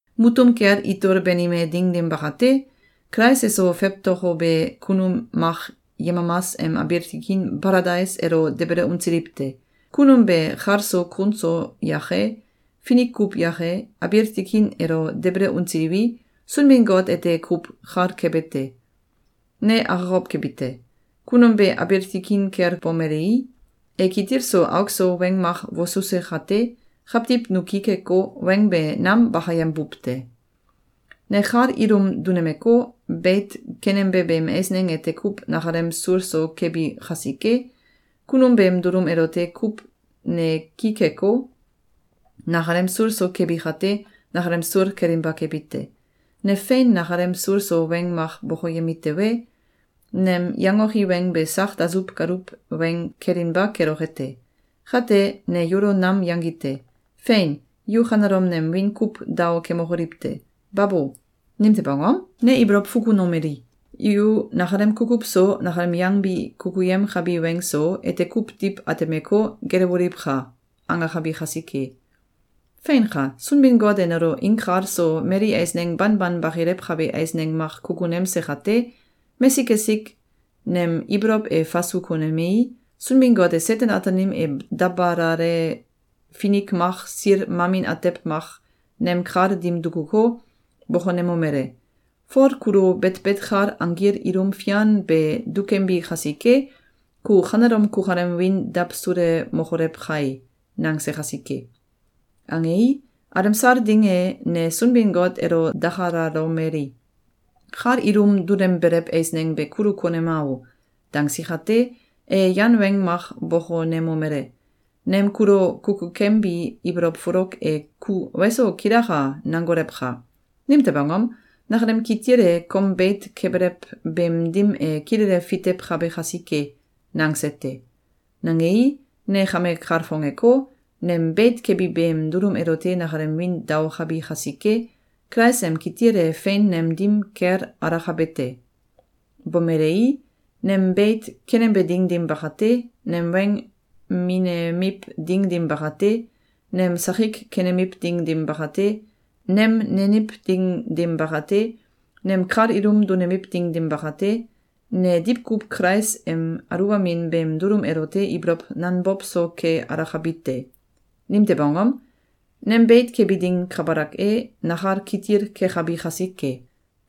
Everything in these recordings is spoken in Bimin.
Mutum kel itol banime ding dim bakate, Kulais eso fewtokobe kunum mak yemamas em abiil tikin Baladais elo debele unsiliw te. Kunum be kal so kun so yake, finik kuw yake, abiil tikin elo debele unsiliwi, Sunbin-Got ete kuw kal kebe te. Ne akokow kebi te. Kunum be abiil tikin kel bomelei, e kitil so auk so weng mak wosuse kate, kawtiw nu ki keko, weng be nam bakayembuw te. Ne kal ilum dunemeko, beit kenembe beem eisneng ete kuw nakalem sul so kebi kasike, kunum beem dulum elote kuw ne ki keko, nakalem sul so kebi kate, nakalem sul kelinba kebi te. Ne fein nakalem sul so weng mak bokoyemi tewe, nem yangoki weng be sak dasuw galuw weng kelinba keloke te. Kate, ne yulo nam yangi te. Fein! Yu kanelom nem wiin kuw dao kemokoliw te! Babo! Nimtew angom? Ne ibolow fukunomeli: “Yu nakalem kukuw so, nakalem yangbi kukuyemkabi weng so, ete kuw diw atemeko, gelewoliwka!”, angakabi kasike. Feinka! Sunbin-Got e nelo inkal so mali eisneng banban bakilewkabe eisneng mak kukunemse kate, mesik esik nem ibolow e fasu konemei, Sunbin-Got e Seten-Ataanim em dabalale finik mak sil mamin atew mak nem kal dim dukuko, bokonemomele: “Fol kulo betbet kal anggil ilum fian be dukembi kasike, ku kanelom kukalem wiin dawsulemokolew kai!”, nangse kasike. Angei, alemsal ding e, ne Sunbin-Got elo dakalalomeli: “Kal ilum dunembelew eisneng be kulu konema o!”, dangsi kate, e yan weng mak bokonemomele: “Nem kulo kukukembi ibolow folok e ku ‘Weso! Kilaka!’, nangolewka! Nimtew angom? Nakalem kitil e kom beit kebelew beem dim e kilele fitewkabe kasike!”, nangse te. Nangei, ne kame kalfongeko, nem beit kebi beem dulum elote nakalem wiin daokabi kasike, Kulais em kitil e fein nem dim kel alakabe te. Bomelei, nem beit kenembe ding dim bakate, nem weng minemiw ding dim bakate, nem sakik kenemiw ding dim bakate, nem neniw ding dim bakate, nem kal ilum dunemiw ding dim bakate, ne diwkuw Kulais em aluwbamin beem dulum elote ibolow nanbow so ke alakabi te. Nimtew angom? Nem beit kebi ding kabalak e, nakal kitil kekabi kasike.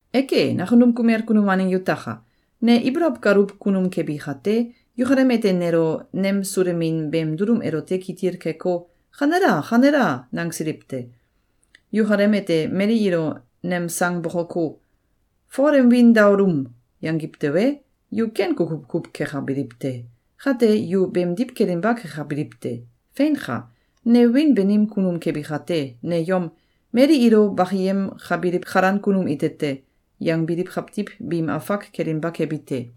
Eke, nakunum kumel kunum waneng yutaka! Ne ibolow galuw kunum kebi kate, yukalem ete nelo nemsulemin beem dulum elote kitil keko, “Kanela! Kanela!”, nangsiliw te. Yukalem ete mali ilo nem sang bokoko, “Fol em wiin daolum!”, yangiw tewe, yu ken kukuw kuw kekabiliw te. Kate, yu beemdiw kelinba kekabiliw te. Feinka! Ne wiin banim kunum kebi kate, ne yom “Mali ilo bakiyemkabiliw kalan kunum ite te!”, yangbiliw kawtiw biim afak kelinba kebi te.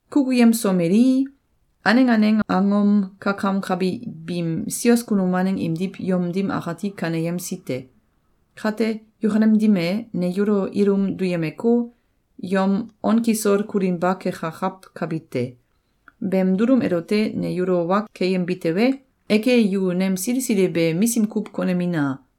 Kukuyemsomelii, aneng aneng angom kakamkabi biim sios kunum waneng imdiw yom dim akati kaneyemsi te. Kate, yukalem dim e, ne yulo ilum duyemeko, yom on kisol kulinba kekakawkabi te. Beem dulum elote ne yulo wa keyembi tewe, eke, yu nem sili sili be misim kuw konemina!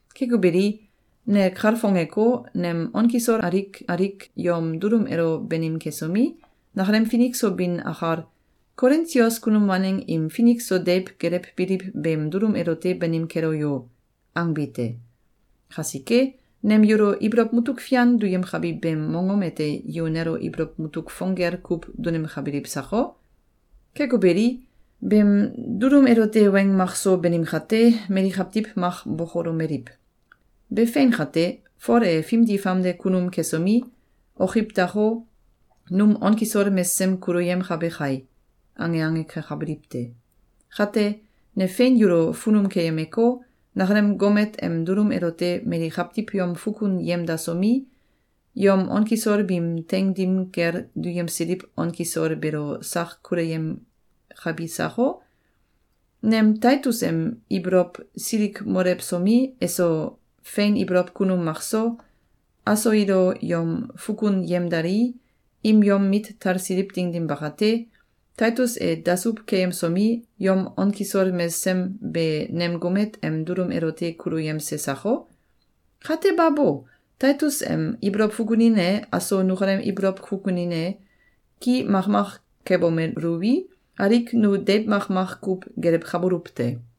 Keko beli, ne kalfongeko, nem on kisol alik alik yom dulum elo banim kesomi, nakalem finik so bin akal “Kolin sios kunum waneng im finik so deiw gelewbiliw beem dulum elote banim kelo yo!”, angbi te. Kasike, nem yulo ibolow mutuk fian duyemkabi beem mongom ete yu nelo ibolow mutuk fong gel kuw dunemkabiliw sako? Keko beli, beem dulum elote weng makso banim kate, mali kawtiw mak bokolomeliw: “Be fein kate, Fol e fimdi famde kunum kesomi, okiwdako, num on kisol mesesem kuluyemkabe kai!”, ange ange kekabiliw te. Kate, ne fein yulo funum keyemeko, nakalem gomet em dulum elote mali kawtiw yom fukun yemdasomi, yom on kisol biim teing dim kel duyemsiliw on kisol beelo sak kuluyemkabi sako? Nem Taitus em ibolow silikmolewsomi, eso, fein ibolow kunum mak so, aso ilo yom fukun yemdalii, im yom mit talsiliw ding dim bakate, Taitus e dasuw keyemsomi, yom on kisol mesesem be nem gomet em dulum elote kuluyemse sako? Kate babo! Taitus em ibolow fukunin e, aso nukalem ibolow fukunin e, ki makmak kebomeluwi, alik nu deiw makmak kuw gelewkabuluw te.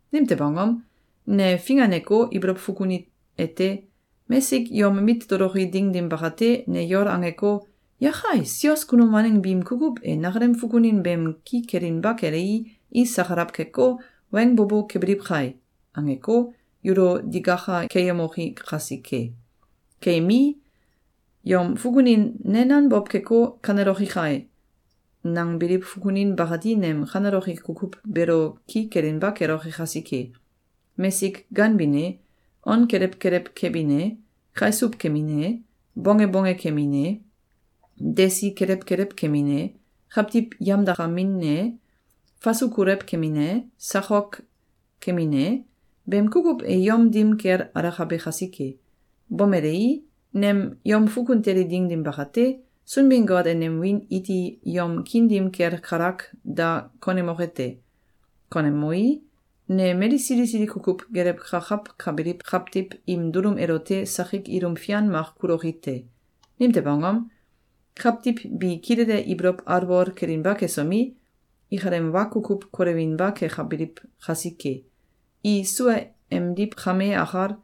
Nimtew angom? Ne finganeko, ibolow fukuni ete: Mesik yom mit toloki ding dim bakate, ne yol angeko, “Yakai! Sios kunum waneng biim kukuw e nakalem fukunin beem ki kelinba kelei, i sakalaw keko, weng bo bo kebiliw kai!”, angeko, yulo digaka keyemoki kasike. Keyemii, yom fukunin “Ne nanbow keko, kaneloki kai!”, nangbiliw fukunin bakati nem kaneloki kukuw beelo ki kelinba keloke kasike. Mesik ganbin e, on kelew kelew kebin e, kaisuw kemin e, bonge bonge kemin e, desi kelew kelew kemin e, kawtiw yamdakamin e, fasu kolew kemin e, sakok kemin e, beem kukuw e yom dim kel alakabe kasike. Bomelei, nem yom fukun teli ding dim bakate, Sunbin-Got e nem wiin iti yom kiin dim kel kalak da konemoke te. Konemei, ne mali sili sili kukuw gelewkakawkabiliw kawtiw im dulum elote sakik ilum fian mak kuloki te. Nimtew angom? Kawtiw bi kilele ibolow alwol kelinba kesomi, ikalem wa kukuw kolewinba kekabiliw kasike. I sua emdiw kame akal,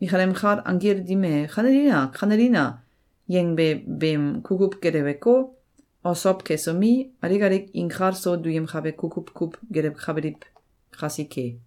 ikalem kal anggil dim em “Kanelina! Kanelina!”, yangbe beem kukuw geleweko, osow kesomi, alik alik inkal so duyemkabe kukuw kuw gelewkabiliw kasike.